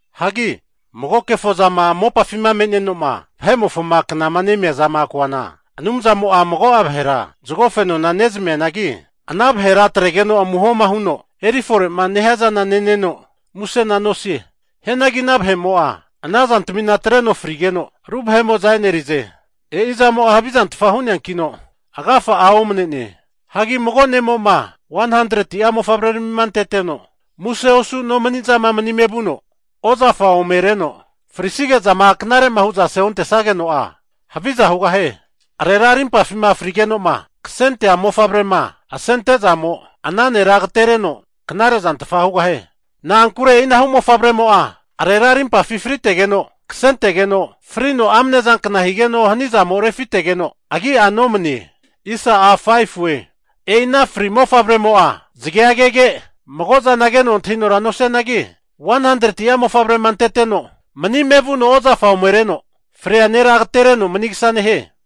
Hagi mago kefo zama mopafima me'neno'ma vahe'mofoma knama nemia zama koana, Anumzamo'a mago'a vahera zago fenona nezmianagi, ana vahera atregeno amuho'ma huno eri fore'ma nehiazana neneno musena nosie. Hianagi ana vahe'mo'a ana zantamina atreno frigeno, ru vahe'mo'za e'nerize. E'i zamo'a havizantfa hu'neankino, agafa'a omne'ne. Hagi mago ne'mo'ma 100'a mofavreramima anteteno muse osu nomani'zama manime vuno ozafa omereno frisige'zama knare'ma hu'za aseontesageno'a, haviza hugahie. Arera arimpafima fri'negeno'ma kasentea mofavrema asente'zamo, ana nera agatereno knare zantfa hugahie. Na'ankure e'inahu mofavremo'a arera rimpafima fritegeno kasentegeno, frino amnezankna higeno hanizamo refitegeno agi'a nomane. E'i ana fri mofavremo'a zagea kege, mago zana keno antahinora nosianagi, 100'a mofavrema anteteno manime vuno ozafa omereno fria nera agatereno manigasa nehie.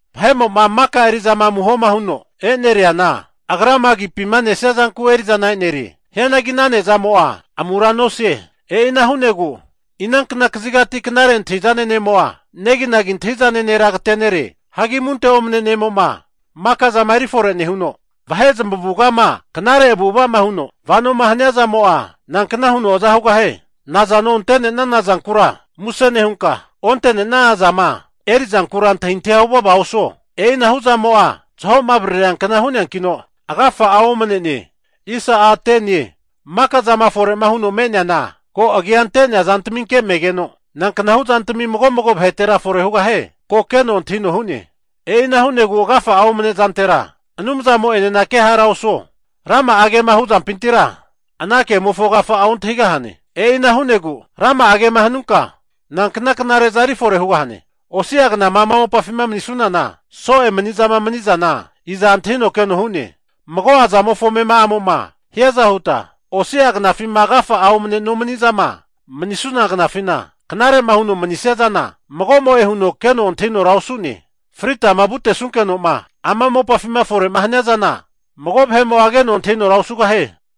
Vahe'mo'ma maka eri'zama amuhoma huno eneriana agrama agipima nesia zanku eri'zana enerie. Hianagi ana nezamo'a amura nosie. E'ina hu'negu inankna kazigati knare antahi'zane ne'mo'a, neginagi antahi'zane nera agatere'ne? Hagi amunte omne ne'mo'ma maka zama eri fore nehuno, vahe zamavugama knare avu'ava'ma huno vanoma hania zamo'a, nankna huno aza hugahie? Nazano ante'nenana zankura muse nehunka, onte'nenana zama erizankura antahintahia huvava osuo. E'inahu zamo'a zaho'ma avaririankna hu'neankino, agafa'a omane'ne. Maka zama fore'ma huno me'neana, ko agia ante'nea zantaminke megeno, nanknahu zantami mago mago vahetera fore hugahie, ko Anumzamo'a keno antahino hu'ne. E'ina hu'negu agafa'a omane zantera, Anumzamo'enena kehara osuo. Rama'a kema hu zampintira, ana kemofo agafa'a ontahigahane. E'ina hu'negu rama'a kema hanunka, nankna knare'za erifore hugahane? Osi'a knama ama mopafima manisunana, so'e manizama mani'zana iza antahino keno hu'ne. Mago'a zamofo amema'amo'ma hiaza huta, osi'a knafima agafa'a omane nomanizama manisuna knafina, knare'ma huno manisia zana magomo'e huno keno antahinora osu'ne. Fritama vutesunkenoma ama mopafima fore'ma hania zana, mago vahe'mo'a keno antahinora osugahie.